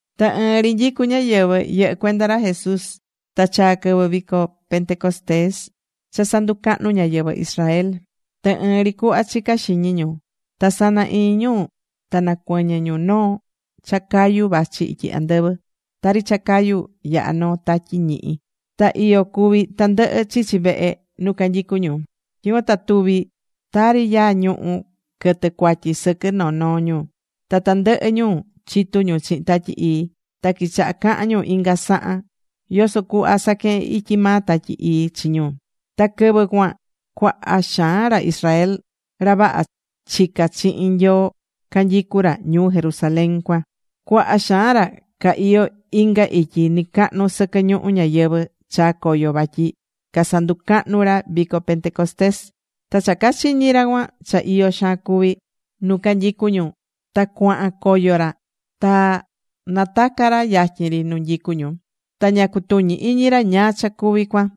Ta ɨɨn ri nyicú ñáyɨvɨ yɨhɨ́ cuenda ra Jesús ta chaa̱ quɨvɨ vico Pentecostés cha sanducahnú ñáyɨvɨ Israel. Ta ɨɨn ri cuhva chicá xiñi ñu. Ta sana iñi ñu ta nacuɨñɨ̱ ñu noo cha cayu vachi ityi andɨvɨ. Tari cha cayu yahá noo tatyi ñihi. Ta iyo cuví tandɨhɨ chichí vehe nu canyicú ñu. Tyicuan ta tuvi̱ tari yaa ñuhu̱ quɨtɨ̱ cuatyi sɨquɨ noo noo ñu. Ta tandɨhɨ ñu chitu ñu chihin Tatyi Ii. Ta quichaha̱ cahan ñu inga sahan yoso cuhva saquehen ityi maa Tatyi Ii chi ñu. Ta quɨvɨ cuan cuaha xaan ra Israel ra vaha chicá chihin Nyoo canyicú ra ñuu Jerusalén cuan. Cuaha xaan ra ca iyó inga ityi nɨcahnu sɨquɨ ñuhú ñayɨvɨ̱ chaa̱ coyo vatyi casanducahnu ra vico Pentecostés. Ta cha cachiñi̱ ra cuan cha iyo xaan cuví nu canyicú ñu, ta cuahan coyo ra ta nataca̱ ra yatyin ri nu nyicú ñu. Ta ña cutuñí iñi ra ñáá cha cuví cuan,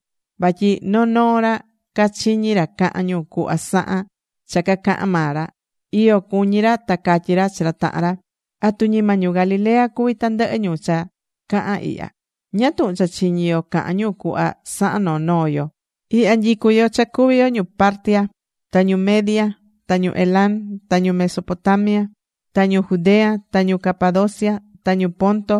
vatyi noo noo ra cachiñí ra cahán ñu cuhva sahan cha cacahán maa ra. Iyo cuñí ra ta catyí ra chi ra tahan ra: ―¿Atu ñima ñu Galilea cuví tandɨhɨ ñu cha cahán ihya? ¿Ñáá tuhun cha chiñí yo cahán ñu cuhva sahan noo noo yo? Ihya nyicú yo cha cuví yo ñu Partia, ta ñu Media, ta ñu Elam, ta ñu Mesopotamia, ta ñu Judea, ta ñu Capadocia, ta ñu Ponto,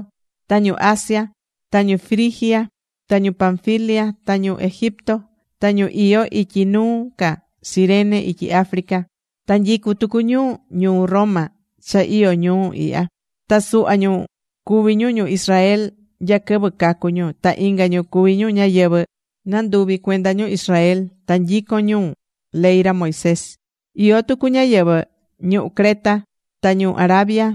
ta ñu Asia. Ta ñu Frigia ta ñu Panfilia, ta ñu Egipto, ta ñu iyó ityi nuu ca Cirene ityi Africa. Ta nyicú tucu ñu ñuu Roma cha iyó ñuu ihya. Ta suhva ñu cuví ñu ñu Israel nya quɨvɨ cacu̱ ñu. Ta inga ñu cuví ñu ñáyɨvɨ nanduvi̱ cuenda ñu Israel ta nyicon ñu ley ra Moisés. Iyó tucu ñáyɨvɨ ñuhú Creta ta ñu Arabia.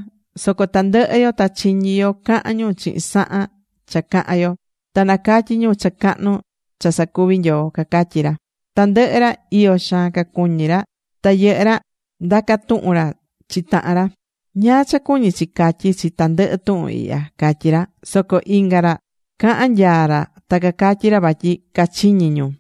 Soco tandɨhɨ yo ta chiñí yo cahán ñu chihin sahan cha cahán yo. Ta nacatyí ñu cha cahnu cha sacuví Nyoo ―cacatyí ra. Tandɨhɨ ra, iyo xaan cacuñí ra, ta yɨhɨ́ ra ndacá tuhun ra chi tahan ra: ―¿Ñáá cha cuñí chi catyí chi tandɨhɨ tuhun ihya? ―catyí ra. Soco inga ra cahán nyaa ra ta cacatyí ra vatyi cachiñí ñu.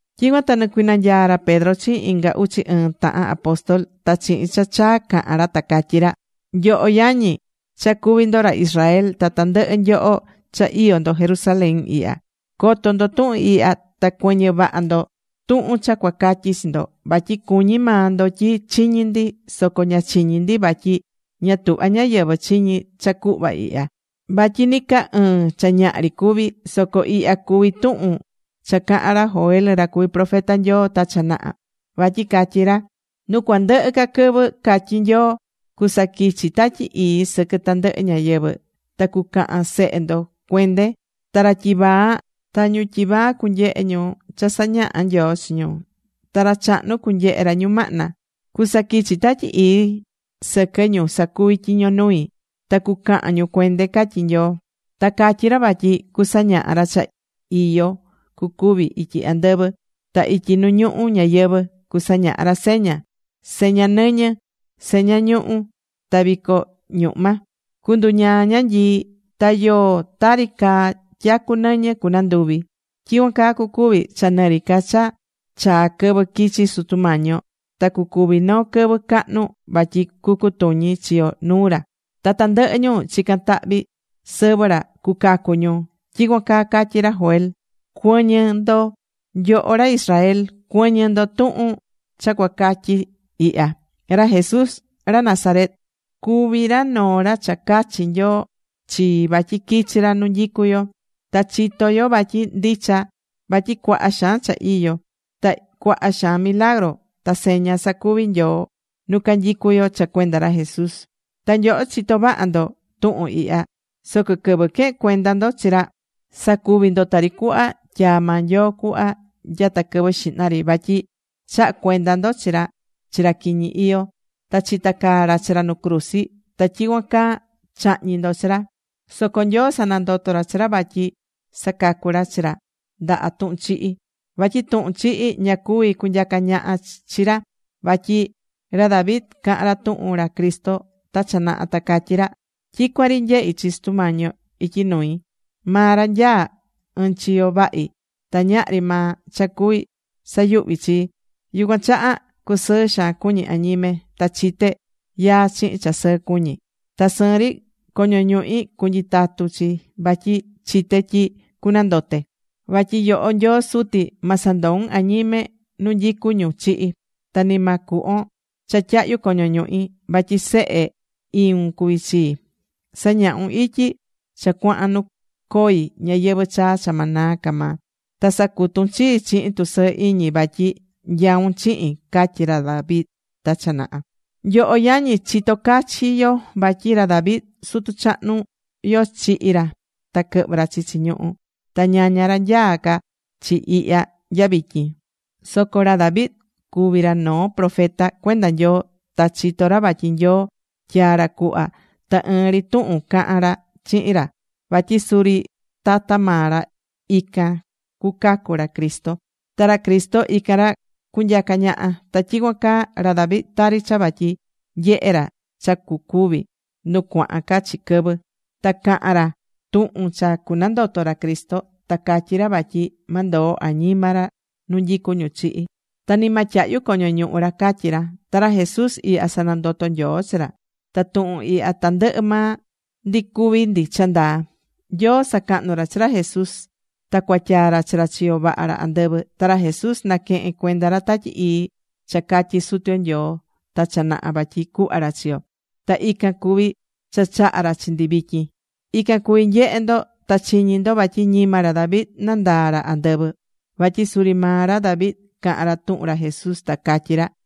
Tyicuan ta nicuinanyaa̱ ra Pedro chihin inga uchi ɨɨn tahan apóstol. Ta chihin cha chaa caha̱n ra ta catyí ra: ―Nyoho yañi, cha cuví ndo ra Israel, ta tandɨhɨ nyoho cha iyó ndo Jerusalén ihya. Co̱to ndo tuhun ihya. Ta cuɨ̱ñɨ vaha ndo tuhun cha cuacatyi chi ndo. Vatyi cuñí maa ndo tyi chiñí ndi. Soco ña chiñí ndi, vatyi ña tuhvá ñáyɨvɨ chiñi cha cuhva ihya, vatyi ni ca ɨɨn cha ñaha ri cuví. Soco ihya cuví tuhun cha caha̱n ra Joel, ra cuvi̱ profeta Nyoo ta cha naha. Vatyi catyi̱ ra: Nu cuandɨhɨ ca quɨvɨ, catyí Nyoo, cusaquichi Tatyi Ii sɨquɨ tandɨhɨ ñáyɨvɨ. Ta cucahan sehe ndo cuende. Ta ra tyivaa ta ñu tyivaa cunyehe ñu cha sañaha Nyoo chi ñu. Ta ra chahnu cunyehe ra ñumahna. Cusaquichi Tatyi Ii sɨquɨ ñu sacuví tyiño nui. Ta cucahan ñu cuende, catyí Nyoo. Ta catyi ra vatyi cusañaha ra cha iyo cucuvi ityi andɨvɨ. Ta ityi nu ñuhu ñayɨvɨ̱ cusañaha ra seña, seña nɨñɨ, seña ñuhu̱, ta vico ñuhma. Cunduñaa ñanyii. Ta yoo tari caa tyacu nɨñɨ cunanduvi. Tyicuan caa cucuvi cha nɨri ca cha chaá quɨvɨ quichi Sutu Mañi yo. Ta cucuvi noo quɨvɨ cahnu vatyi cucutuñi chi yo nuu ra. Ta tandɨhɨ ñu chicán tahvi sɨvɨ ra cucacu ñu. Tyicuan caa catyi̱ ra Joel. ’Cuɨ̱ñɨ ndo nyoho ra Israel. Cuɨ̱ñɨ ndo tuhun cha cuacatyi ihya. Ra Jesús ra Nazaret cuví ra noo ra cha cachi̱ Nyoo chi vatyi quichi ra nu nyicu yo. Ta chitó yo vatyi ndicha vatyi cuaha xaan cha iyo, ta cuaha xaan milagru ta seña sacuvi̱ Nyoo nu canyicú yo cha cuenda ra Jesús. Ta nyoho chitó vaha ndo tuhun ihya. Soco quɨvɨ quehe̱n cuenda ndo chi ra, sacuvi̱ ndo tari cuhva tyaa̱ maa Nyoo cuhva nyata quɨvɨ xihna ri. Vatyi chaha̱ cuenda ndo chi ra chi ra quiñi iyó. Ta chitacaa̱ ra chi ra nu cruzi. Ta tyicuan caa chahñi̱ ndo chi ra. Soco Nyoo sanandoto̱ ra chi ra vatyi sacacu̱ ra chi ra ndaha tuhun chihi. Vatyi tuhun chihi ña cuví cunyaca ñaha chi ra. Vatyi ra David caha̱n ra tuhun ra Cristo ta cha naha, ta catyí ra: Tyicuan ri nyehí chi Sutu Mañi yo ityi nui. Maa ra nyaá ɨɨn chiyo vahi ta ñahri maa cha cuví sayuhvi chii. Yucuan chaha cusɨɨ xaan cuñí añime. Ta chité yaa chihin cha sɨɨ cuñí. Ta sɨɨn ri coño ñuhi cunyitatu chi vatyi chité tyi cunandote. Vatyi yoho Nyoo Suti, ma sandoun añime nu nyicu ñu chihi, ta ni ma cuhvon cha tyahyu coño ñuhi. Vatyi sehe iun cuví chii. Sañahún ityi cha cuahán nu coi ñayɨvɨ̱ chaa cha ma naa ca maa. Ta sacutún chii chihin tusɨɨ iñi vatyi nyaún chihin, catyí ra David ta cha naha. ’Nyoho yañi, chitó cachi yo vatyi ra David sutu chahnu yo chihi̱ ra ta quɨhvɨ̱ ra chichi ñuhu. Ta ñaña ra nyaá ca chi ihya nya vityin. Soco ra David cuvi̱ ra noo profeta cuenda Nyoo. Ta chitó ra vatyi Nyoo tyaa̱ ra cuhva ta ɨɨn ri tuhun cahan ra chihin ra vatyi suri tata maa ra ican cuacacu ra Cristo. Ta ra Cristo, ican ra cunyaca ñaha. Ta tyicuan caa ra David tari cha vatyi nyehe̱ ra cha cuacuvi nu cuahan ca chi quɨvɨ. Ta caha̱n ra tuhun cha cunandoto ra Cristo. Ta catyi̱ ra vatyi ma ndoo añima ra nu nyicu ñu chihi̱. Ta ni ma tyahyu coño ñuhu ra, catyí ra. Ta ra Jesús ihya sanandoto̱ Nyoo chi ra. Ta tuhun ihya tandɨhɨ maa ndi cuví ndi cha ndaa. Nyoo sacahnú ra chi ra Jesús, ta cuatyaa̱ ra chi ra chiyo vaha ra andɨvɨ. Ta ra Jesús naquehe̱n cuenda ra Tatyi Ii cha catyi̱ Sutu yo Nyoo ta cha naha vatyi cuhva ra chi yo. Ta ican cuví cha chahá ra chi ndi vityin. Ican cuví nyehé ndo ta chiñí ndo. Vatyi ñima ra David nandaa̱ ra andɨvɨ. Vatyi suri maa ra David caha̱n ra tuhun ra Jesús, ta catyí ra: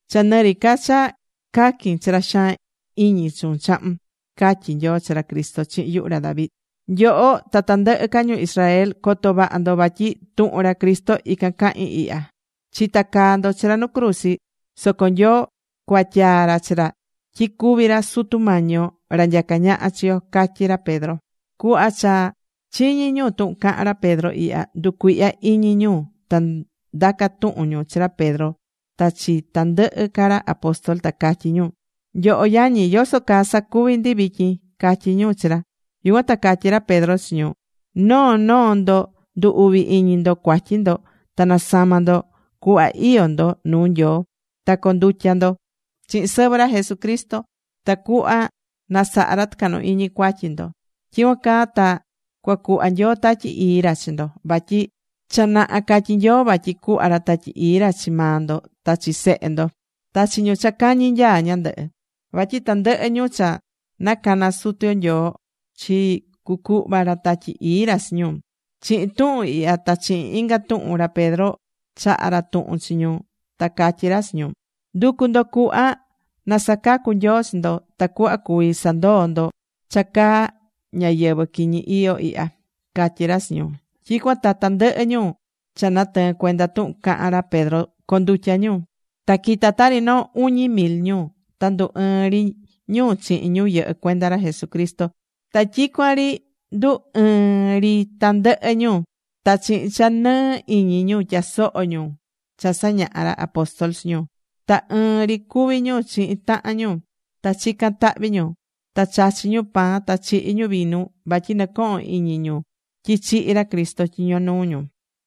cha nɨri ca cha caquin chi ra xaan iñi chuun chahun”, catyi Nyoo chi ra Cristo chihin yuhu ra David. ’Nyoho ta tandɨhɨ ca ñu Israel, co̱to vaha ndo vatyi tuhun ra Jesús ican cahín ihya. Chitacaa̱ ndo chi ra nu cruzi. Soco Nyoo cuatyaa̱ ra chi ra tyi cuvi ra Sutu Mañi yo, ra nyaca ñaha chi yo ―catyí ra Pedro. Cuhva cha chiñi̱ ñu tuhun caha̱n ra Pedro ihya, nducuihya̱ iñi ñu. Ta ndaca̱ tuhun ñu chi ra Pedro ta chi tandɨhɨ ca ra apóstol, ta catyi ñu: ―Nyoho yañi, ¿yoso caa sacuví ndi vityin? ―catyí ñu chi ra. Yucuan ta catyí ra Pedro chi ñu: ―Noo noo ndo ndu̱ uvi iñi ndo cuatyi ndo ta na̱sama ndo cuhva iyó ndo nuu Nyoo. Ta co̱ndutya ndo chihin sɨvɨ ra Jesucristo. Tacuhva na saha ra tɨcahnu iñi cuatyi ndo. Tyicuan caa ta cua cuhva Nyoo Tatyi Ii ra chi ndo. Vatyi cha naha catyi̱ Nyoo vatyi cuhva ra Tatyi Ii ra chi maa ndo, ta chi sehe ndo, ta chi ñu cha cañi nyaa ñandɨhɨ. Vatyi tandɨhɨ ñu cha nacana̱ Sutu Mañi yo Nyoo chii cucuhva ra Tatyi Ii ra chi ñu. Chihin tuhun ihya ta chihin inga tuhun, ra Pedro chahá ra tuhun chi ñu ta catyí ra chi ñu: ―Ndu̱cu ndo cuhva na sacacu Nyoo chi ndo, tacuhva cuví sandoo ndo cha caa ñáyɨvɨ quiñi iyó ihya ―catyí ra chi ñu. Tyicuan ta tandɨhɨ ñu cha natɨɨ̱n cuenda tuhun caha̱n ra Pedro condutya̱ ñu. Ta quita tari noo uñi mil ñu, ta ndu ɨɨn ri ñu chihin ñu yɨhɨ́ cuenda ra Jesucristo. Ta tyicuan ri ndu ɨɨn ri tandɨhɨ ñu, ta chihin cha nɨɨ iñi ñu tyasoho ñu cha sañahá ra apóstol chi ñu. Ta ɨɨn ri cuví ñu chihin tahan ñu, ta chicán tahvi ñu ta chachí ñu pan ta chihí ñu vinu vatyi nɨcohón iñi ñu tyi chihi̱ ra Cristo tyiño nuu ñu.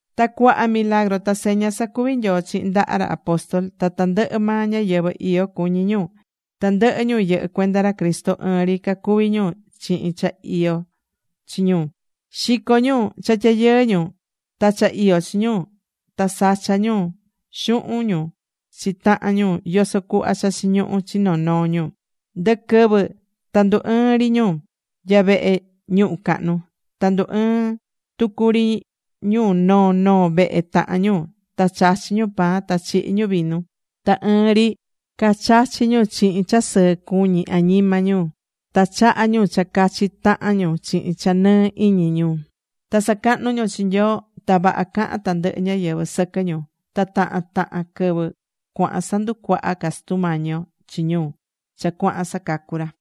Ta cuaha milagru ta seña sacuvi̱ Nyoo chihin ndaha ra apóstol. Ta tandɨhɨ maa ñáyɨvɨ iyo cuñí ñu. Tandɨhɨ ñu yɨhɨ́ cuenda ra Cristo ɨɨn ri cacuví ñu chihin cha iyó chi ñu. Xicó ñu cha tyayɨɨ ñu ta cha iyó chi ñu. Ta sachá ñu xuhun ñu chi tahan ñu yoso cuhva cha chiñuhú chi noo noo ñu. Ndɨquɨvɨ ta ndu ɨɨ́n ri ñu nya vehe ñuhu cahnu. Ta ndu ɨɨ́n tucu ri ñu noo noo vehe tahan ñu ta chachí ñu pan ta chihí ñu vinu. Ta ɨɨn ri cachachí ñu chihin cha sɨɨ cuñí añima ñu. Ta chahá ñu cha cachi tahan ñu chihin cha nɨɨ iñi ñu. Ta sacahnú ñu chi Nyoo. Ta vaha cahán tandɨhɨ ñáyɨvɨ sɨquɨ ñu. Ta tahan tahan quɨvɨ cuahan sanducuahá ca Sutu Mañi yo chi ñu cha cuahán sacacu ra.